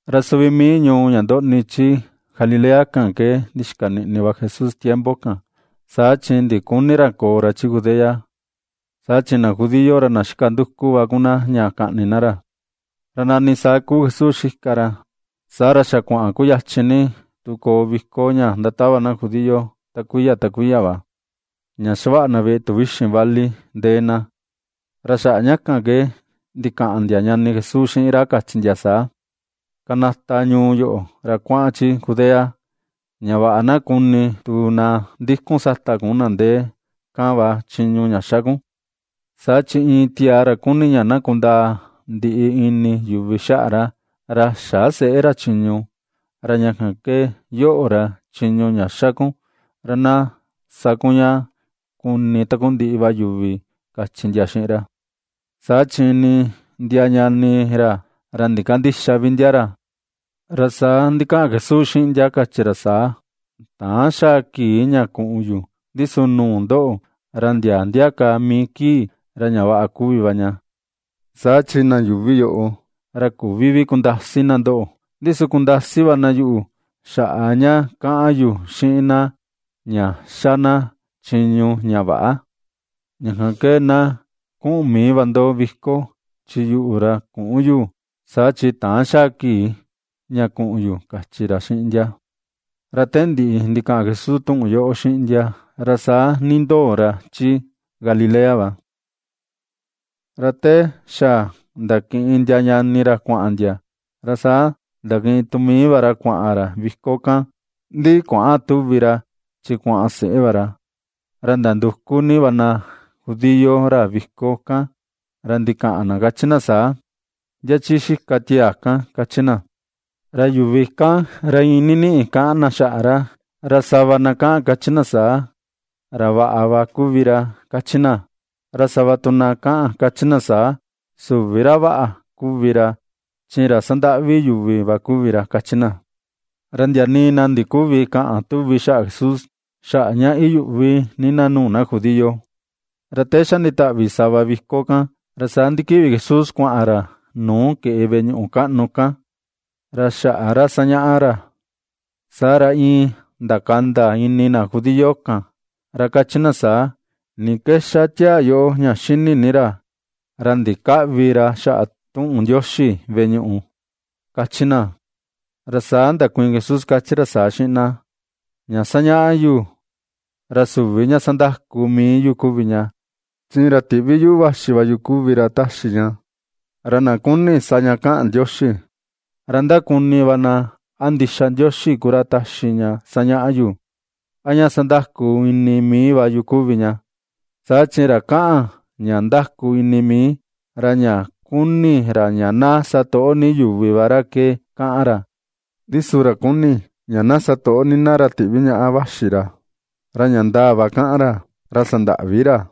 Ra suvi mii ñuu ña ndoꞌni chi Galilea kan ke, ndixika niꞌni va Jesús tiempo kan, saa chi ndiküni ra koo ra chi Judea, saa chi na judío ra na xika nduku va ku na ña kaꞌni na ra. Ra nani saa kuu Jesús xika ra, saa ra xa kuaꞌan kuyachin ni tu koo viko ña ndatava na judío, ta kuiya ta kuiya va, ña xavaꞌa na veꞌe tuvixin vali ndee na. Ra xaꞌa ña kan ke ndikaꞌan ndia ñani Jesús xiꞌin ra kachi ndia saa: ―Kanata ñuu yoꞌo, ra kuaꞌan chi Judea, ña vaꞌa na kuni tu na ndikun sata kun na ndee kan va chiñu ña xa kun. Saa chi iin tiaa ra kuni ña na kundaa ndiꞌi ini yuvi xaꞌa ra, ra xä seꞌe ra chiñu. Ra ña kan ke yoꞌo, ra chiñu ña xa kun ra na sa kun ña kuni takundiꞌi va yuvi ―kachi ndia xiꞌin ra. Saa chi nii ndia ñani ra, ra ndikandïxa vi ndia ra. Ra saa ndikaꞌan Jesús xiꞌin ndia kachi ra saa: ―Täan xaa kii ña kuꞌun yu, ndi su nuu ndoꞌo ra ndia ndia ka mii kii ra ña vaꞌa kuvi va ña. Saa chi na yuuvi yoꞌo, ra küvi vi kundasi na ndoꞌo, ndi su kundasi va na yuꞌu, xaꞌa ña kaꞌan yu xiꞌin na ña xa na chiñu ña väꞌa. Ña kan ke na kuꞌun mii va ndo viko, chi yuꞌu ra küꞌun yu, saa chi täan xa kii ña kuꞌun yu ―kachi ra xiꞌin ndia. Ra te ndiꞌi ndikaꞌan Jesús tuꞌun yoꞌo xiꞌin ndia, ra saa nindoo ra chi Galilea va. Ra te xa ndakiꞌin ndia ñani ra kuaꞌan ndia, ra saa ndakiꞌin tu mii va ra kuaꞌan ra viko kan, ndi kuäꞌan tuvi ra, chi kuaꞌan seꞌe va ra. Ra ndanduku ni va na judío ra viko kan, ra ndikaꞌan na kachi na saa: ―¿Ndia chi xika tiaa kan? ―kachi na. Ra yuvi kan ra iin niniꞌi kaꞌan na xaꞌa ra. Ra sava na kaꞌan kachi na saa: “Ra vaꞌa va kuvi ra”, kachi na. Ra sava tu na kaꞌan kachi saa: “Süvi ra vaꞌa kuvi ra, chi ra sandaꞌvi yuvi va kuvi ra”, kachi na. Ra ndia nii na ndiküvi kaꞌan tuvi xaꞌa Jesús, xaꞌa ña iyuꞌvi na nuu na judío. Ra te xa nditaꞌvi sava viko kan, ra saa ndikiꞌvi Jesús kuaꞌan ra nuu keꞌe veꞌe ñuꞌu kaꞌnu, ra xaꞌa ra sañaꞌa ra. Saa ra iin ndakanda ini na judío kan ra kachi na saa: ―¿Ni ke ^xa tiaa yoꞌo ña xini ni ra, ra ndikäꞌvi ra xaꞌa tuꞌun Ndioxi veꞌe ñuꞌu? ―kachi na. Ra saa ndakuiin Jesús kachi ra saa xiꞌin na: ―Ña sañaꞌa yu, ra süvi ña sandaku mii yu kuvi ña, chi ra tiꞌvi yuꞌu vaxi va yu kuvi ra ^taxi ña. Ra na kuni sa ña kaꞌan Ndioxi, ra ndakuni va na a ndixa Ndioxi ku ra taxi ña sañaꞌa yu, a ña sandaku ini mii va yu kuvi ña. Saa chi ra kaꞌan ña ^ndaku ini mii, ra ña kuni ra ña na satoꞌo ni yuvi va ra ke kaꞌan ra; ndi su ra kuni ña na satoꞌo ni na ra tiꞌvi ñaꞌa vaxi ra, ra ña ndaa va kaꞌan ra, ra sandäꞌvi ra.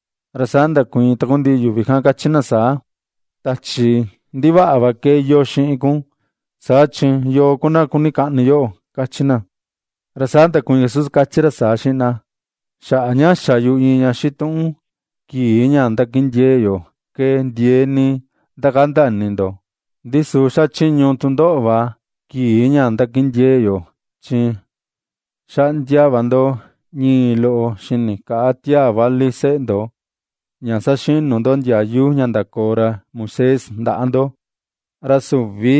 Ra saa ndakuiin takundiꞌi yuvi kan kachi na saa: ―Tachi ndivaꞌa va ke iyoo xiꞌin kun, saa chi ¿yoo ku na kuni kaꞌni yoꞌo? ―kachi na. Ra saa ndakuiin Jesús kachi ra saa xiꞌin na: ―Xaꞌa ña xa yu iin ña xituꞌun kii ndakindiee yo ke ndiee ni ndakanda ini ndo. Ndi su xachiñu tu ndoꞌo va kii ña ndakindiee yo, chi xaꞌndia va ndo ñii loꞌo xini kaꞌa tiaa vali seꞌe ndo, ña saxinu ndo ndiayu ña ndakoo ra Moisés ndaꞌa ndo (ra süvi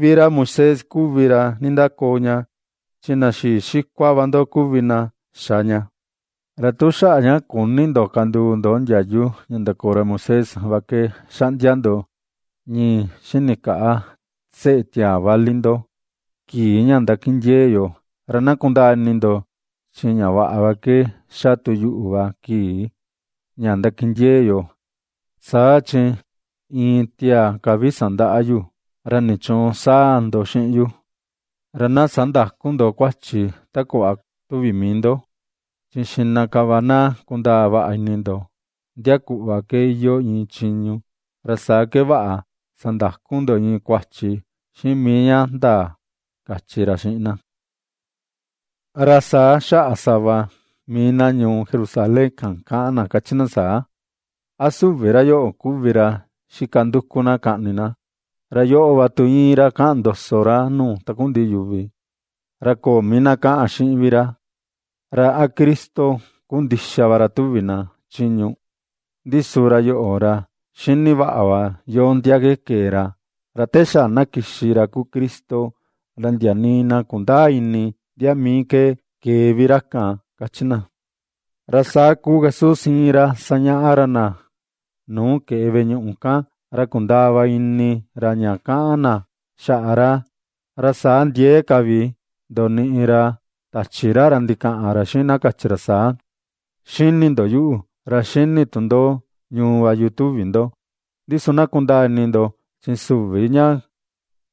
vi ra Moisés kuvi ra nindakoo ña, chi na xii xikua va ndo kuvi na xa ña). Ra tu xaꞌa ña küni ndo kanduu ndo ndiayu ña ndakoo ra Moisés va ke xaꞌndia ndo ñii xini kaꞌa seꞌe tiaa vali ndo kii ña ndakindiee yo, ra na kundaa ini ndo, chi ña vaꞌa ke xa tu yuꞌu va kii ña ndakindiee yo, saa chi iin tiaa ka vi sandaꞌa yu, ¿ra nichuun sáa̱ ndo xiꞌin yu? Ra na sandäku ndo kuachi ta kuꞌva tuvi mii ndo, chi xiꞌna ka va na kundaa vaꞌa ini ndo ndia kuꞌva ke iyoo iin chiñu ra saa ke vaꞌa sandaku ndo iin kuachi xiꞌin mii ña ndaa ―kachi ra xiꞌin na. Ra saa xaꞌa sava mii na ñuu Jerusalén kan kaꞌan na kachi na saa: ―¿A süvi ra yoꞌo, kuvi ra xika nduku na kaꞌni na? Ra yoꞌo va tu íin ra kaꞌan ndoso ra nuu takundiꞌi yuvi, ra köo mii na kaꞌan xiꞌin vi ra. ¿Ra a Cristo ku ndixa va ra tuvi na chiñu? Ndi su ra yoꞌo, ra xini va yo ndia ke kee ra, ra te xa na kixi ra kuu Cristo ra ndia nii na kundäa ini ndia mii ke kee vi ra kan ―kachi na. Ra saa kuu Jesús íin ra sañaꞌa ra na nuu keꞌe veꞌe ñuꞌu kan, ra kundaa va ini ra ña kaꞌan na xaꞌa ra, ra saa ndiee ka vi ndoniꞌi ra tachi ra, ra ndikaꞌan ra xiꞌin na kachi ra saa: ―^Xini ndo yuꞌu, ra ^xini tu ndo ñuu va yu tuvi, ndo, ndi su na kundaa ini ndo, chi süvi ña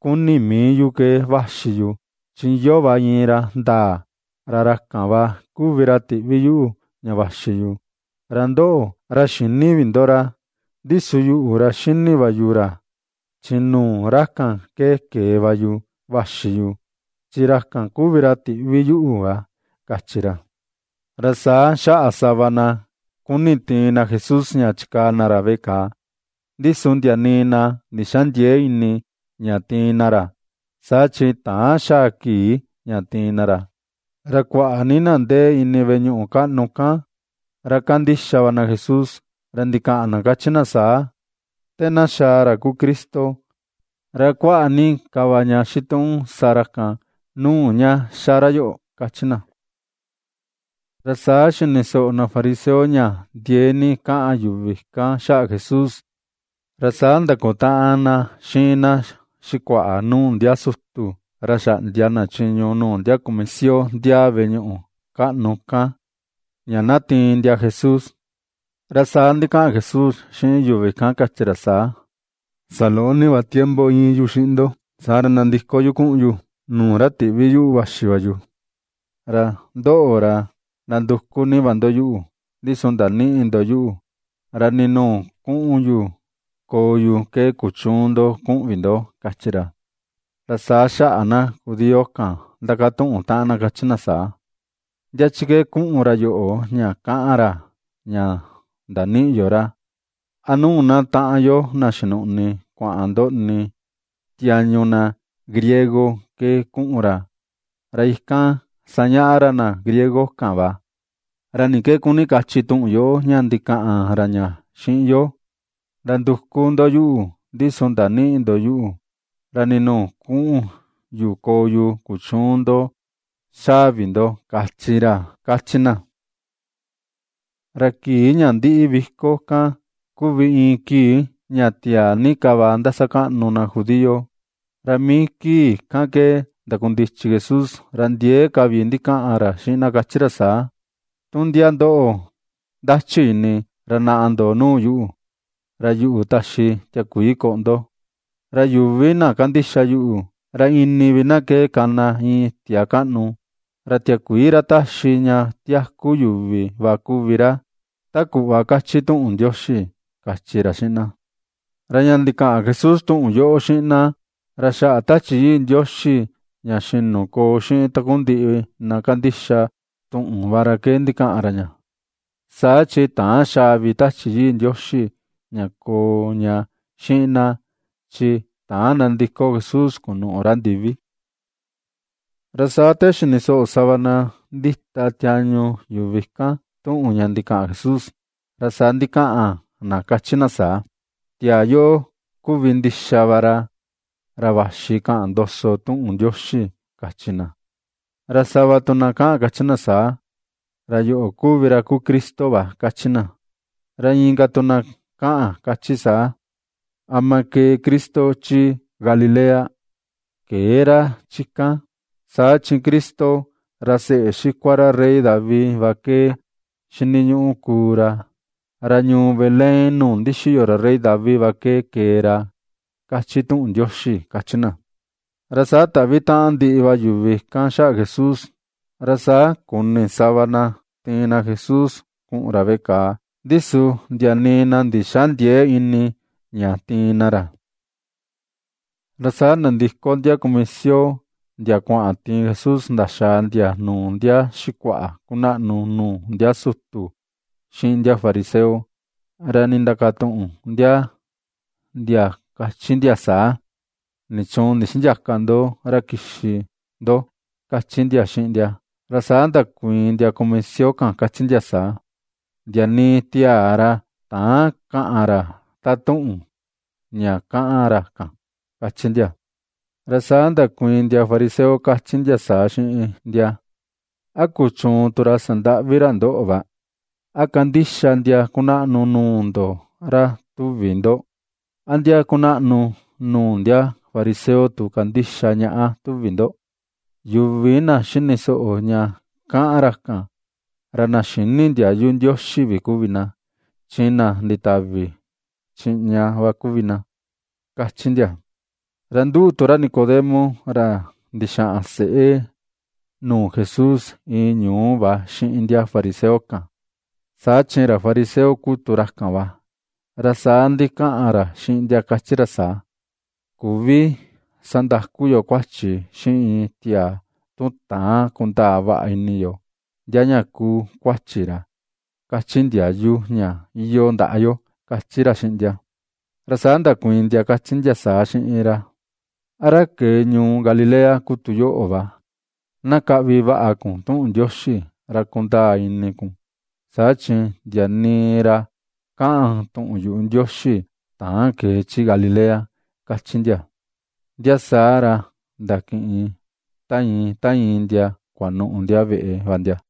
kuni mii yu ke vaxi yu, chi iyoo va iin ra ndaa, ra ra kan va kuvi ra tiꞌvi yuꞌu ña vaxi yu, ra ndoꞌo, ra xïni vi ndo ra. Ndi su yuꞌu ra xini va yu ra, chi nuu ra kan ke kee va yu vaxi yu, chi ra kan kuvi ra tiꞌvi yuꞌu va ―kachi ra. Ra saa xaꞌa sava na kuni tiin na Jesús ña chikaa na ra veꞌe kàà, ndi su ndia nii na ndixändiee ini ña tiin na ra, saa chi täan xaa kii ña tiin na ra. Ra kuaꞌa ni na ndee ini veꞌe ñuꞌu kaꞌnu kan, ra kandixa va na Jesús, ra ndikaꞌan na ^kachi na saa: ―Te na xaa ra kuu Cristo, ¿ra a kuaꞌa ni ka va ña xituꞌun sa ra kan, nuu ña ^xa ra yoꞌo? ―kachi na. Ra saa xini soꞌo na fariseo ña ndiee ni kaꞌan yuvi kan xaꞌa Jesús, ra saa ndakutaꞌan na xiꞌin na xikuaꞌa nuu ndia sutu ra xaꞌndia na chiñu nuu ndia kumisio ndiaa veꞌe ñuꞌu kaꞌnu kan, ña na tiin ndia Jesús. Ra saa ndikaꞌan Jesús xiꞌin yuvi kan kachi ra saa: ―Saloꞌo ni va tiempo íin yu xiꞌin ndo, saa ra nandiko yu kuꞌun yu nuu ra tiꞌvi yuꞌu vaxi va yu. Ra ndoꞌo, ra nanduku ni va ndo yuꞌu, ndi su ndanïꞌi ndo yuꞌu, ra nii nuu kuꞌun yu koo yu ke kuchüun ndo kuꞌun vi ndo ―kachi ra. Ra saa xaꞌa na judío kan ndakatuꞌun taꞌan na kachi na saa: ―¿Ndia chi ke kuꞌun ra yoꞌo ña kaꞌan ra, ña ndanïꞌi yo ra? ¿A nuu na taꞌan yo, na xinuꞌni kuaꞌan ndoꞌni tiañu na griego ke kuꞌun ra, ra ikan sañaꞌa ra na griego kan va? ¿Ra ni ke kuni kachi tuꞌun yoꞌo ña ndikaꞌan ra ña xiꞌin yo: “Nanduku ndo yuꞌu, ndi su ndanïꞌi ndo yuꞌu, ra nii nuu kuꞌun yu koo yu, kuchüun ndo xaa vi ndo kachi ra”? ―kachi na. Ra kii ña ndiꞌi viko kan kuvi iin kii ña tiaa ni ka va ndasakaꞌnu na judío. Ra mii kii kan ke ndakundichi Jesús ra ndiee ka vi ndikaꞌan ra xiꞌin na kachi ra saa: ―Tu ndia ndo ndachi ini, ra naꞌa ndo nuu yu, ra yuꞌu taxi tiakuii koꞌo ndo. Ra yuvi na kandixa yuꞌu, ra ini vi na ke kana iin itia kaꞌnu, ra tiakuii ra taxi ña tiaku yuvi va kuvi ra, ta kuꞌva kachi tuꞌun Ndioxi ―kachi ra xiꞌin na. Ra ña ndikaꞌan Jesús tuꞌun yoꞌo xiꞌin na, ra xaꞌa Tachi Yii Ndioxi ña xinu koo xiꞌin takundiꞌi na kandixa tuꞌun va ra ke ndikaꞌan ra ña; saa chi täan xaa vi Tachi Yii Ndioxi ña koo ña xiꞌin na, chi täan nandiko Jesús kunuꞌu ra ndivi. Ra saa te xini soꞌo sava na ndita tiañu yuvi kan, tuꞌun ña ndikaꞌan Jesús, ra saa ndikaꞌan na kachi na saa: ―Tiaa yoꞌo kuvi ndixa va ra vaxi kaꞌan ndoso tuꞌun yuꞌu Ndioxi ―kachi na. Ra sava tu na kaꞌan kachi saa: ―Ra yoꞌo kuvi ra kuu Cristo va ―kachi na. Ra inka tu na kaꞌan kachi saa: ―¿Ama kee Cristo chi Galilea? Këe ra chi kan. Saa chi Cristo, ra seꞌe xikua ra rey David va ke xiniñuꞌu kuu ra, ra ñuu Belén nuu ndixiyo ra rey David va ke kee ra, kachi tuꞌun Ndioxi ―kachi na. Ra saa taꞌvi taꞌan ndiꞌi va yuvi kan xaꞌa Jesús. Ra saa kuni sava na tiin na Jesús kuꞌun ra veꞌe kàà, ndi su ndia nii na ndixändiee ini ña tiin na ra. Ra saa nandiko ndia kumisio, ndia kuaꞌan tiin Jesús ndaxaa ndia nuu ndia xikuaꞌa kunaꞌnu nuu ndia sutu xiꞌin ndia fariseo, ra nindakatuꞌun ndia ndia kachi ndia saa: ―¿Nichuun ndixïndiaka ndo ra kixi ndo? ―kachi ndia xiꞌin ndia. Ra saa ndakuiin ndia kumisio kan kachi ndia saa: ―¡Ndia nii tiaa ra täan kaꞌan ra taꞌan tuꞌun ña kaꞌan ra kan! ―kachi ndia. Ra saa ndakuiin ndia fariseo kachi ndia saa xiꞌin ndia: ―¿A kuchuun tu ra sandaꞌvi ra ndoꞌo va? ¿A kandixa ndia kunaꞌnu nuu ndo ra, tuvi ndo? ¿A ndia kunaꞌnu nuu ndia fariseo tu kandixa ñaꞌa, tuvi ndo? ¡Yuvi na xini soꞌo ña kaꞌan ra kan, ra na xïni ndiayu Ndioxi vi kuvi na, chi na nditavi chiꞌña va kuvi na! ―kachi ndia. Ra nduꞌu tu ra Nicodemo, ra ndixaꞌan seꞌe nuu Jesús iin ñuu va xiꞌin ndia fariseo kan, saa chi fariseo ku tu ra kan va, ra saa ndikaꞌan ra xiꞌin ndia kachi ra saa: ―Küvi vi sandaku yo kuachi xiꞌin iin tiaa, tu täan kundaa vaꞌa ini yo ndia ña kuu kuachi ra, kachi ndiayu ña iyoo ndaꞌa yo ―kachi ra xiꞌin ndia. Ra saa ndakuiin ndia, kachi ndia saa xiꞌin ra: ―¿A ra kee ñuu Galilea ku tu yoꞌo va? Na kaꞌvi vaꞌa kun tuꞌun Ndioxi, ra kundaa ini kun, saa chi ndia nii ra kaꞌan tuꞌun yuꞌu Ndioxi täan kee chi Galilea ―kachi ndia. Ndia saa ra ndakiꞌin ta iin ta iin ndia kuanuꞌu ndia veꞌe va ndia.